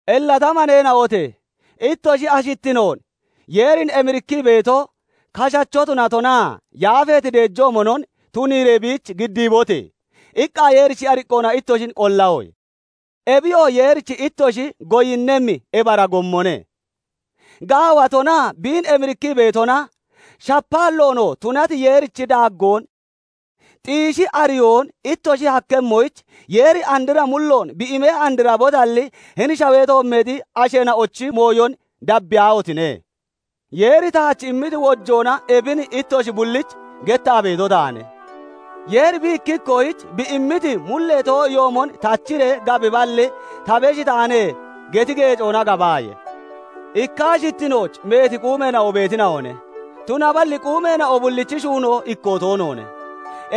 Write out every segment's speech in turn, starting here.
Illa ta maneena'ote! "Ittoshi ashittinoon Yeerin emirikkii beeto, kashacho tunatonaa yafeeti deejoomonon tuniiree biich giddiibote!" iqqa Yeerichi ariqqoona ittoshin qollahoye; ebiyoo Yeerich ittoshi goyinnemmi ibara gommone. Gaawatonaa biin emirikkii beetona, shapaalloonoo tunati Yeerichi daaggoon xiishii ariyoon ittoshi hakkemmoyich, Yeeri andra mulloon bi imee andrabotalli, hini shawee toommeexi asheena'ochi mooyon dabbiyaahotine! Yeeri taach immiti wojoona ebin ittoshi bullich gettaa beeto taane; Yeeri bi ikki ikkoyich bi immiti mullee too'iyoomon tachiree gabiballi, "Ta besh taane" geti geecoona gabaaye; ikka ashittinooch meeti quumeena'o beetina'one; tunaballi quumeena'o bullichi shuunoo ikkoo toonoone.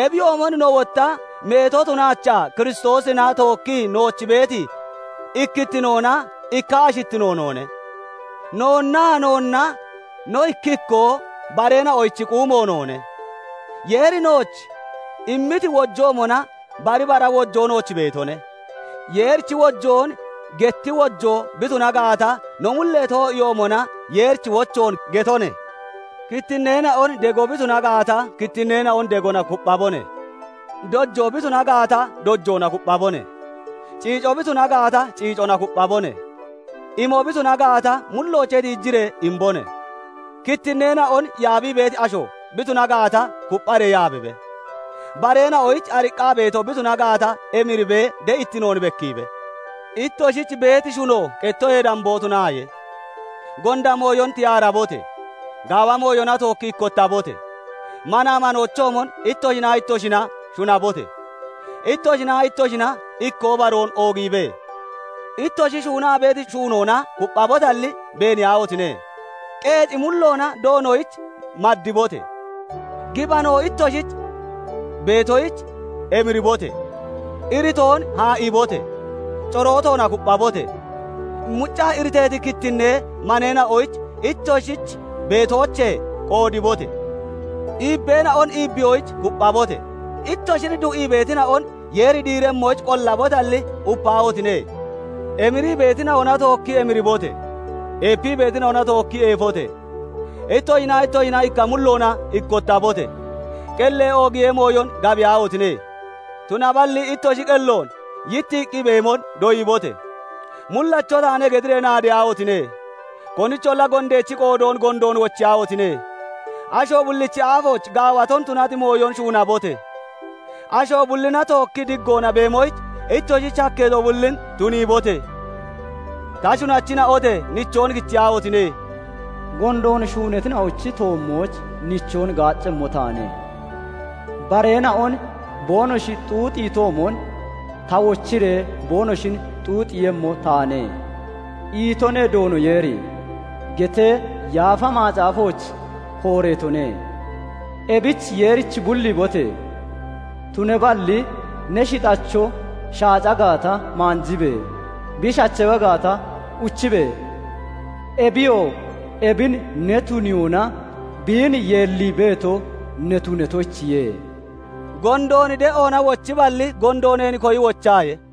Ebiyoomon no wotta meeto tunaachaa Kiristoosina tookkii nooch beeti ikkittinoona ikka ashittino noone; noonnaa noonna no ikki ikkoo bareena'ochi quumo noone. Yeeri nooch immiti wojoomona bari bara wojoo nooch beetone; Yeerichi wochoon getti wojoo bi tuna gaata, no mullee too'iyoomona Yeerichi wochoon getone; kittinneena'on dego bi tuna gaata, kittinneena'on degona kupphabone; dojoo bi tuna gaata, dojoona kupphabone; ciico bi tuna gaata, ciicona kupphabone; imo bi tuna gaata, mulloochee tiijiree imbone; kittinneena'on yaabii beeti asho bi tuna gaata, kuppharee yaabibe; bareena'oyich ariqqaa beeto bi tuna gaata, emiribee de'ittinoon bekkiibe. Ittoshich beeti shuno qettoyee damboo tunaaye. Gonda mooyon tiyaarabote! Gaawa mooyona tookki ikkottabote! Manaa manoochoomon ittoshinaa ittoshina shunabote! Ittoshinaa ittoshina ikkoo baroon oogiibe! Ittoshi shuunaa beeti shuunoona kupphabotalli beeniyaahotine! Qeeci mulloona Doonoyich maddibote! Gibano ittoshich beetoyich emiribote! Iritoon haa'ibote! Corootoona kupphabote! Muccaa iriteeti kittinnee maneena'oyich ittoshich beetoochee qoodibote! Iibbeena'on iibbiyoyich kupphabote! Ittoshin du'ii beetina'on Yeeri diiremmoyich qollabotalli, upaahotine! Emirii beetina'ona tookki emiribote! Eepii beetina'ona tookki eefote! Ittoshinaa ittoshina ikka mulloona ikkottabote! Qellee oogiyee mooyon gabiyaahotine! Tunaballi ittoshi qelloon yittiiqqi beemon doyibote! "Mullacho taane" getiree naadeyaahotine! Konicholla gondeechi qoodoon gondoon wochiyaahotine! Asho bullichi aafooch gaawato tunati mooyon shuunabote! Asho bullina tookkii diggoona beemoyich ittoshich hakkeeto bullin tuniibote! Ta shunachina'ote! Nichoon kichiyaahotine! " 'Gondoon shuunatina'ochi toommooch nichoon gaaccemmo taane; bareena'on boonoshi xuuxiitoomon ta wochiree boonoshin xuuxiiyemmo taane' itone Doono Yeeri" getee Yaafa Macaafooch kooreetone. Ebich Yeerich bulliibote! Tunaballi ne shixacho shaaca gaata, maanjibe! Bi shachawa gaata, uchibe! Ebiyoo ebin ne tuniyoona biin yeellii beeto ne tunatoyichiye. Gondoon de'oona wochiballi, gondo neen koyi wochaaye.